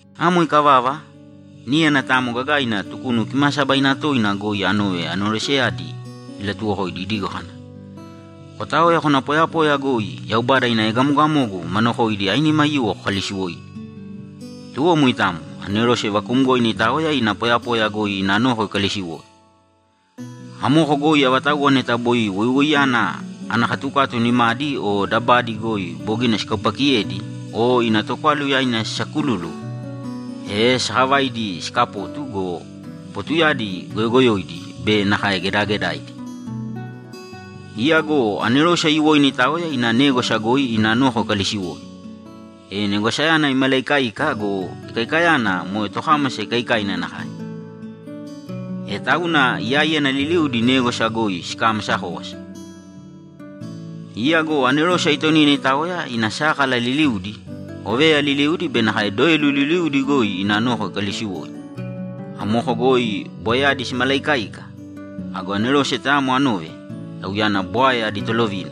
Amo ikavava, níyana tayamo gagaina Tukunu Kimaasabaina Toina goi anove aneroseyadi ilatuwokoidi idigo kana, ‘Kotāoya kōna poyapoya goi Yaubada ina egamogamogu ma nokoidi ainima aiyuwo kokalisiwōidi.’ Tuwo moitamo, anerose vakuumgoina itaoya ina poyapoya goi ina noko ikalisiwoi. Amoko goi avatauwa neta boi woiwoiyana ana katukatu nimadi o dabadi goi bogina sikaupaakiyedi o ina tokwalu yaina sisaakululu, e sakavaidi sikapotu go, potuyadi goyogoyoidi be nakae gedagedaidi. Iya go anerose aiyuwoina itaoya ina négwasa goi ina noko ikalisiwoi, e negwasayana imalaikaika go, ikaikayana moe tokámasa ikaikaina nakae. E tauna iyaíyana liliudi négwasa goi sikamasa kówasa. Iya go anerose aitonina itaoya ina sákala liliudi, oveya liliudi be nakae doelu liliudi goi ina noko ikalisiwoi. Amoko goi bwaeyadi simalaikaika. Ago anerose tayamo anove, tauyana bwae adi tolovina,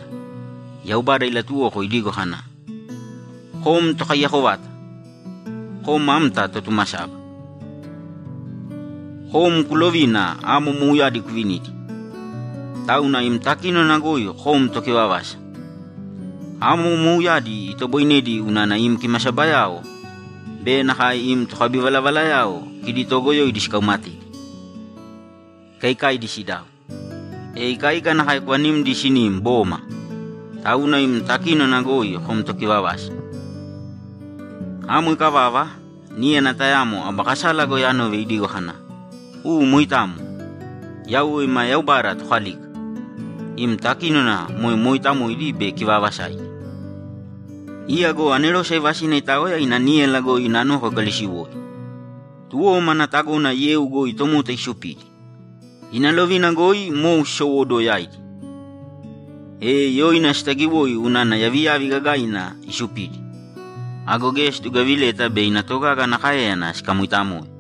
Yaubada ilatuwoko idigo kana, ‘Kom Tokaiyako vata; kom amta Totumasaba. Kom kulovina amo mouyadi kuvinidi, tauna im takínona goi kom tokivavasa. Amo mouyadi itoboinedi unana im kimasabayao be nakae im tokabivalavalayao kidi togoyoidi sikaumatedi, ikaikaidi sidau, e ikaika nakae kuvanimdi sinim, boma! Tauna im takínona goi kom tokivavasa.’ Amo ikavava, níyana tayamo aba kasala goi anove idigo kana, ‘U moitamo, Yauwe ima Yaubada Tokalika, im takínona moe mooitamoidi be kivaavasaidi.’ Iya go anerose aivasina itaoya ina níyala goi ina noko ikalisiwoi. Tuwo mana tagona yeu goi tomota isupidi. Ina lovina goi mou sisowóduwo yaidi, e yoina sitagiwoi unana yaviyavi gagaina isupidi. Ago geya situgavileta bei ina togaga ana káeyana sikamoitamoe.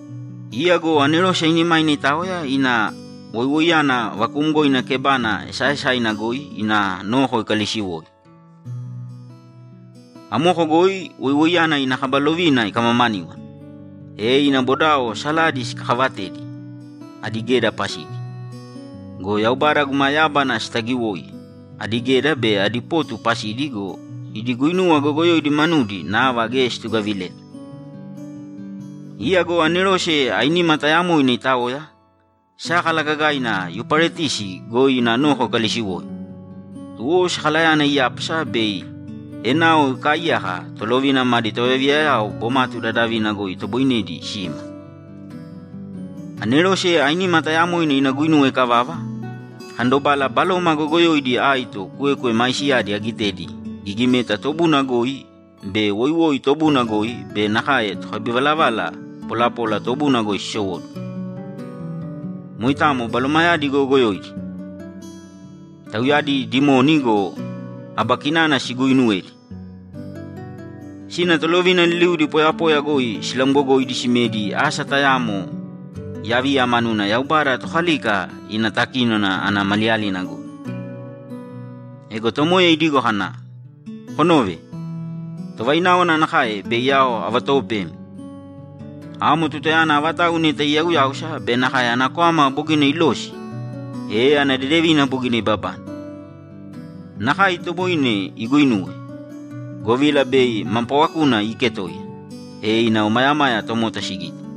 Iya go anerose ainimaina itaoya ina woiwoiyana vakuumgoina kebana esaaesaina goi ina noko ikalisiwoi. Amoko goi woiwoiyana ina kaba lovina ikamamaníwana, e ina bodao saladi sikakavatedi adi geda pasidi. Go Yaubada, Tauyana totobukukui yábana goi, sitagiwoi adi geda be adi potu pasidi go, idi guinuwa goyogoyoidi manudi nava geya situgavileta. Iya go anerose ainima tayamoina itaoya, sákala gagaina Yuparetisi goi ina noko ikalisiwoi. Tuwo sakalayana iyápasa bei enao ikaaiyaka tolovina madi tovayaviyayao bomatu dadavina goi itoboinedi sima. Anerose ainima tayamoina ina guinuwa ikavava, akandobala baloma goyogoyoidi aito kwekwe maisiyadi agitedi gigimeta tobuna goi be woiwoi tobuna goi be nakae tokabivalavala polapola tobuna goi sisowóduwo. Moitamo balomayadi goyogoyoidi. Tauyadi dimoni go, aba kinana siguuinuwedi. Sina tolovina liliudi poyapoya goi silamgogoidi simedi asa tayamo yaviya manuna Yaubada Tokalika ina takínona ana maliyalina goi. Ego Tomoya idigo kana, ‘Konōve! Tovaináwana nakae bei ao avatoopemi. Amo tutayana avatau neta iyauyáusa be nakae ana kwama bogina ilosi, e ana dedevina bogina ibabane. Nakae itoboine iguinuwe, govila bei ma paawakuna iiketoiya, e ina omayamaya tomota sigite.’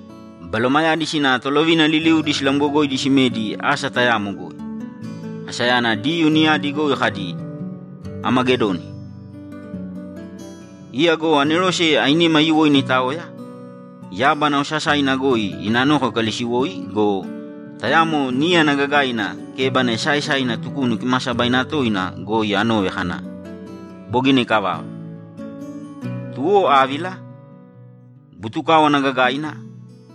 Balomayadi sina tolovina liliudi silamgogoidi simedi asa tayamo goi; asayana Diyuu niyadi goi kadi, ‘Amagedoni.’ Iya go anerose ainima aiyuwoina itaoya, yábana osasaina goi ina noko ikalisiwoi go, tayamo níyana gagaina kébana esaaesaina Tukunu Kimaasabaina Toina goi anove kana, ‘Bogina ikavava.’ Tuwo ávila, butukáwana gagaina,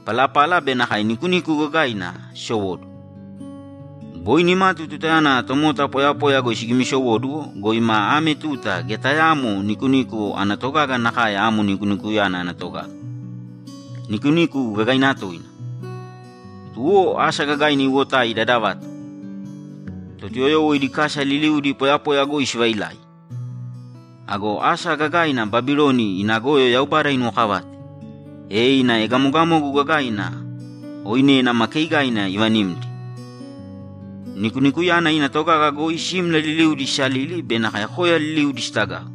palapala be nakae nikuniku gagaina sisowóduwo. Boi nimatu tutayana tomota poyapoya goi sigimisowóduwo go, ima ame tuta geya tayaamo nikuniku ana togaga nakae amo nikunikuyana ana togaga; nikuniku gagaina toina. Tuwo asa gagaina iwotai dadavato. Totuyoyowo idi kasa liliudi poyapoya goi sivailai. Ago asa gagaina Babiloni ina goyo Yaubada inuwokavate, e ina egamogamogu gagaina oinena ma keigaina ivanimdi. Nikunikuyana ina togaga goi simla liliudi sisalili be nakae koya liliudi sitagau.